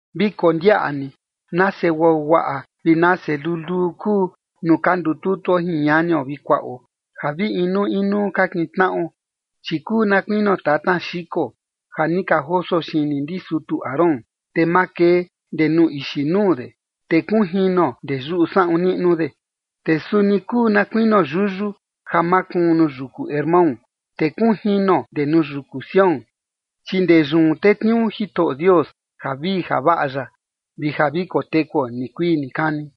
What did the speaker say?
Vi kondiaꞌa ni nase guaguaꞌa vi nase luluu kuu nuu ka ndututuo jin ñanio vi kuaꞌo ja vi inuu inuu ka kintnaꞌo. Chi kuu na kuinio tatna xiko ja ni ka joso xini ndi sutu Aarón, te makee ndee nuu ixi nuu de, te kunjino ndee yuꞌu saꞌun niꞌnu de. Te suni kuu na kuinio yuyu ja makuun nuu yuku Hermón, te kunjino ndee nuu yuku Sión, chi ndee yun tetniuu Jitoꞌo Dios javii javaꞌa ya, vi ja vi kotekuo nikuii nikani.